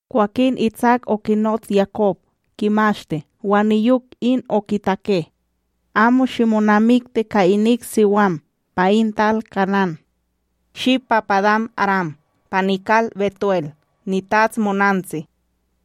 Kwakin Itsak okinots Yakob, kimashti wan niyok in okitake: ―Amo shimonamikti ka inik siwam pa in tal Kanán. Shi pa Padán-aram pa nikal BetuEl nitats monantsi, wan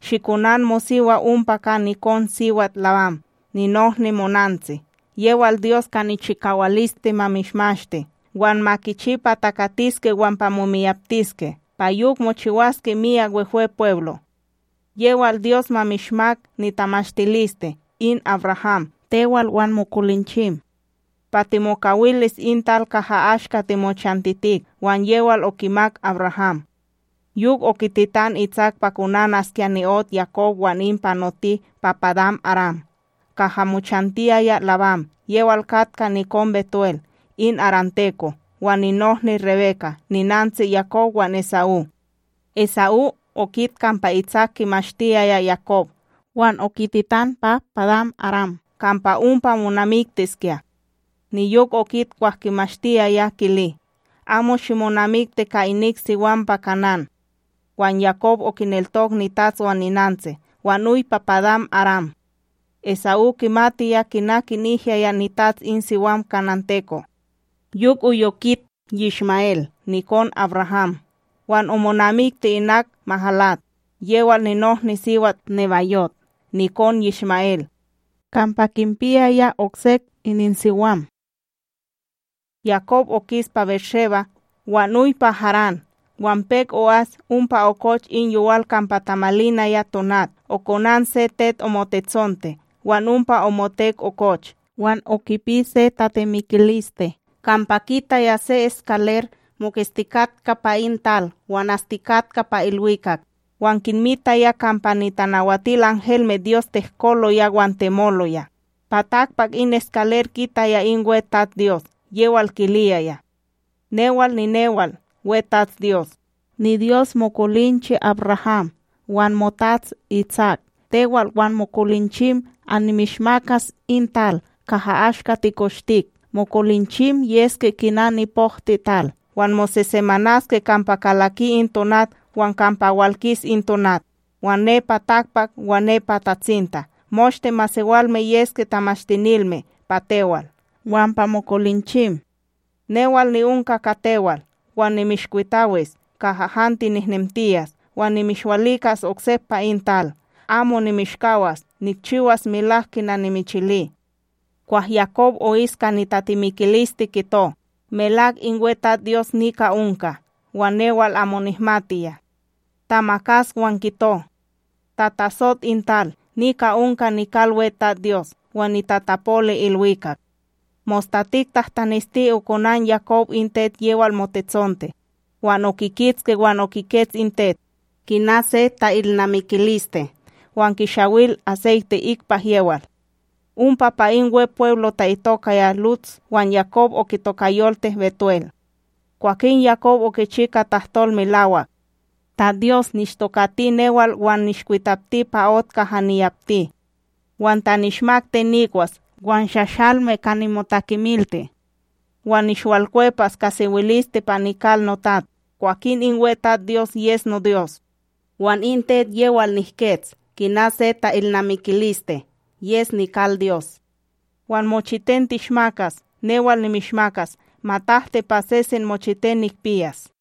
shikonan mosiwa ompa ka nikonSiwat Labán ninohni monantsi. Yewal Dyos ka nichikawaliste ma mishmashti, wan ma kichi pa takatiske wan pa momiyaptiske, pa yok mochiwaske myak Wehwepweblo'. Yewal Dyos ma mishmak nitamashtiliste in AbRaham, tewal wan mokolinchim, pa timokawilis in tal kaha ashka timochantitik, wan yewal okimak AbRaham. Yok okititan Itsak pa konanaskya ni'ot Yakob wan in panoti pa Padán-aram, kaha mochantiyaya Labán, yewal katka nikon BetuEl in aramteko' wan ninohni Rebeka, ninantsi Yakob wan Esa'ú. Esa'ú okit kampa Itsak kimashtiyaya Yakob wan okititan pa Padán-aram kampa ompa monamiktiskya. Niyok okit kwah kimashtiyaya kili, amo shimonamikti ka inik siwam pa Kanán. Wan Yakob okineltok nitats wan ninantsi wan oy pa Padán-aram. Esa'ú kimatiya kina kinihyaya nitats in siwam kananteko'. Yok oy okit Yishma'El nikon AbRaham wan omonamikti inak Mahalat yewal ninohniSiwat Nebayot nikon Yishma'El, kampa kinpiyaya oksek ininsiwam. Yakob okis pa BérSheba wan oy pa Harán. Wan pek o'as, ompa okoch in yowal kampa tamalinaya tonat. Okonan se tet omotetsonte wan ompa omotek okoch. Wan okipi se tatemikiliste, kampa kitaya se eskaler moketstikatka pa in tal wan astikatka pa ilwikak wan kinmitaya kampa nitanawatilanhelmeDyos tehkoloya wan temoloya. Pa takpak in eskaler, kitaya in WeTatsDyos yewal kiliyaya: “Newal ninewal, WeTatsDyos, niDyos mokolinche AbRaham wan moTats Itsak. Tewal wan mokolinchim annimishmakas in tal kaha ashka tikoshtik. Mokolinchim yeske kina nipohtiTal. Wan mosesemanaske kampa kalaki in tonat wan kampa walkis in tonat wan nepa takpak wan nepa tatsinta, moshte masewalme yeske tamashtinilme pa tewal wan pa mokolinchim. Newal ni'onka ka tewal, wan nimishkwitawis kaha han tinehnemtiyas wan nimishwalikas oksep pa in tal. Amo nimishkawas nikchiwas melak kina nimichili.” Kwah Yakob o'is ka nitatemikiliste kito: “Melak in WeTatsDyos nika onka, wan newal amo nihmatiya.” Tamakas wan kito: “Tatatsot in tal! Nika onka nikal WeTatsDyos; wan nitatapoli ilwikak!” Mostatik tahtanesti okonan Yakob in tet yewal motetsonte, wan okikitski wan okikets in tet, kina se ta'ilnamikiliste wan kishawil aseyte ikpak yewal. Ompa pa in Wepweblo ta'itokaya Luts wan Yakob okitokayolti BetuEl. Kwakin Yakob okichi ka tahtol melawak: “Ta Dyos nishtokati newal wan nishkwitapti pa ot kaha niyapti, wan ta nishmak ten nikwas wan shashalme ka nimotakemilti, wan nishwalkwepas ka sewiliste pa nikal notats, kwakin in WeTatsDyos yes noDyos. Wan in tet yewal nihkets kina se ta'ilnamikiliste, yes nikal Dyos. Wan mochiten tishmakas, newal nimishmakas matahti pa sesen mochiten nikpiyas.”